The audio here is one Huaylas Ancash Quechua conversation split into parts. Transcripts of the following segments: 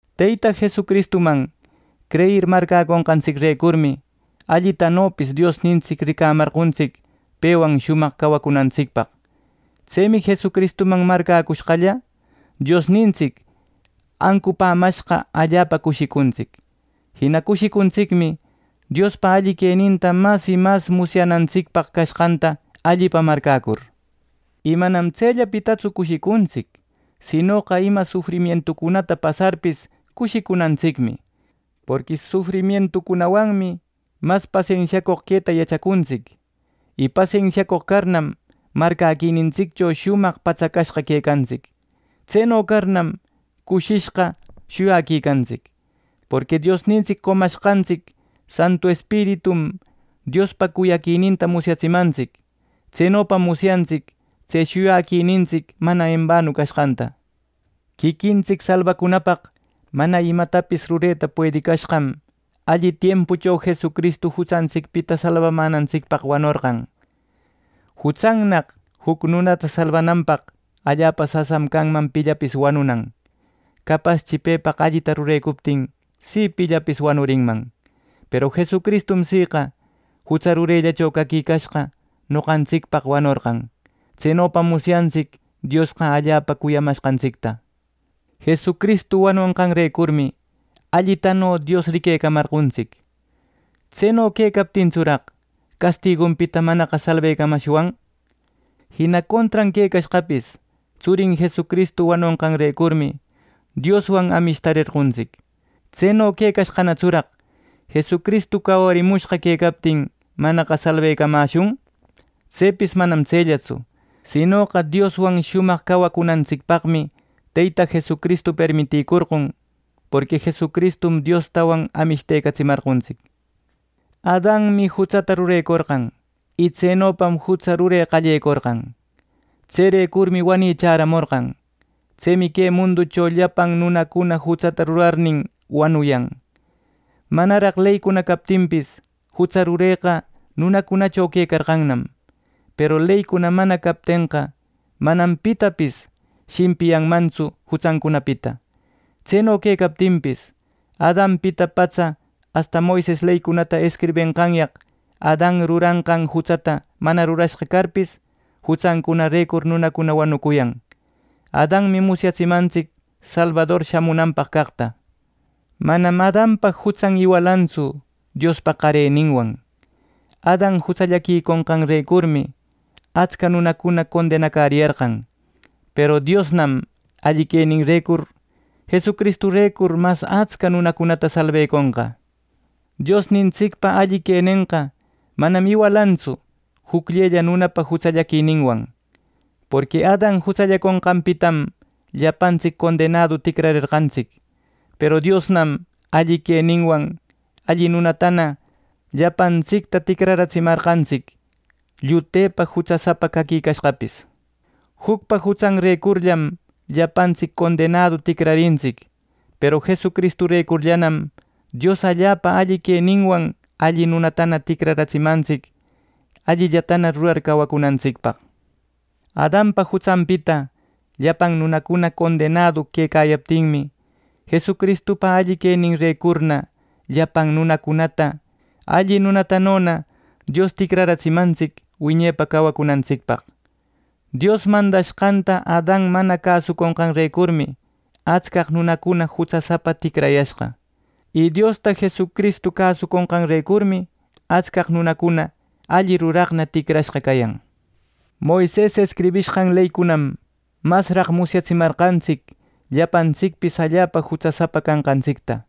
Teyta Jesucristuman creyir marcäconqantsicrecurmi allitanopis Diosnintsic ricamarqontsic pewan shumaq cawacunantsicpaq. Tsemi Jesucristuman marcäcushqalla, Diosnintsic ancupämashqa allapa cushicuntsic. Jina cushicuntsicmi Diospa alli queninta mas y mas musyänantsicpaq cashqanta allipa marcäcur. Y manam tsellapitatsu cushicuntsic. Sinoqa ima sufrimientucunata pasarpis cushicunantsicmi. Porqui sufrimientucunawanmi mas pasensiacoq quetaqa yachacuntsic. Y pasensiacoq carnam, marcäquinintsiccho shumaq patsacashqa quecantsic. Tseno carnam, cushishqa shuyaquicantsic. Porqui Diosnintsic qomashqantsic Santu Espiritum, Diospa cuyaquininta musyatsimantsic. Tsenopam musyantsic tse shuyaquinintsic mana embanu cashqanta. Quiquintsic salbacunapaq mana imatapis rureta puedicashqam alli tiempucho Jesucristu jutsantsicpita salbamänatsicpaq wanorqan. Jutsannaq juc nunata salbananpaq, allapa sasam canman pillapis wanunan. Capaschi pepaq allita rurecuptin si pillapis wanurinman. Peru Jesucristum siqa jutsa rurellacho caquicashqa noqantsicpaq wanorqan. Tsenopam musyantsic Diosqa allapa cuyamashqantsicta. Jesucristu wanonqanrecurmi allitano Dios riquecamarqontsic. ¿Tseno quecartsuraq, castigunpita manaqa salbecamashwan! Jina contran quecashqapis tsurin Jesucristu wanonqanrecurmi Dioswan amishtarqontsic. Tseno quecashqanatsuraq ¿Jesucristu cawarimushqa quecaptin manaqa salbecamäshun! Tsepis manam tsellatsu. Sinoqa Dioswan shumaq cawacunantsicpaqmi Teyta Jesucristu permitïcorqon. Porqui Jesucristum Diostawan amishtecatsimarqontsic. Adanmi jutsata rurecorqan, y tsenopam jutsa rure qallecorqan. Tserecurmi wani shamorqan. Tsemi que munducho llapan nunacuna jutsata rurarnin, wanuyan. Manaraq leycuna captinpis, jutsa rureqa nunacunacho quecarqannam. Peru leycuna mana captenqa, manam pitapis shimpiyanmantsu jutsancunapita. Tseno quecaptinpis, Adanpita patsa asta Moises leycunata escribenqanyaq Adan ruranqan jutsata mana rurashqa carpis, jutsancunarecur nunacuna wanucuyan. Adanmi musyatsimantsic salbador shamunanpaq caqta. Manam Adanpa jutsan iwalantsu Diospa qareninwan. Adan jutsallaquiconqanrecurmi atsca nunacuna condenacäriyarqan. Peru Diosnam alli queninrecur Jesucristurecur mas atsca nunacunata salbeconqa. Diosnintsicpa alli quenenqa manam iwalantsu jucllella nunapa jutsallaquininwan. Porqui Adan jutsallaconqanpitam llapantsic condenadu ticrarerqantsic, peru Diosnam alli queninwan alli nunatana llapantsicta ticraratsimarqantsic, llutepa jutsasapa caquicashqapis. Jucpa jutsanrecurllam llapantsic condenadu ticrarintsic; peru Jesucristurecurllanam Dios allapa alli queninwan alli nunatana ticratsimantsic allillatana rurar cawacunantsicpaq. Adanpa jutsanpita llapan nunacuna condenadu quecayaptinmi, Jesucristupa alli rureninrecurna llapan nunacunata alli nunatanona Dios ticratsimantsic wiñepa cawacunantsicpaq. Dios mandashqanta Adan mana cäsuconqanrecurmi atscaq nunacuna jutsasapa ticrayashqa. Y Diosta Jesucristu cäsuconqanrecurmi atscaq nunacuna alli ruraqna ticrashqa cayan. Moises escribishqan leycunam masraq musyatsimarqantsic llapantsicpis allapa jutsasapa canqantsicta,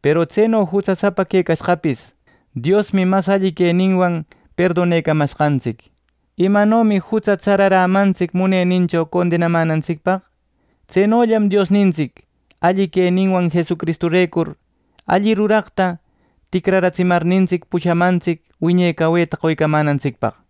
peru tseno jutsasapa quecashqapis Diosmi mas alli queninwan perdonecamashqantsic. Imanomi jutsa tsararämantsic munenincho condenamänantsicpaq; tsenollam Diosnintsic alli queninwan Jesucristurecur alli ruraqta ticratsimarnintsic pushamantsic wiñe caweta qoycamantsicpaq.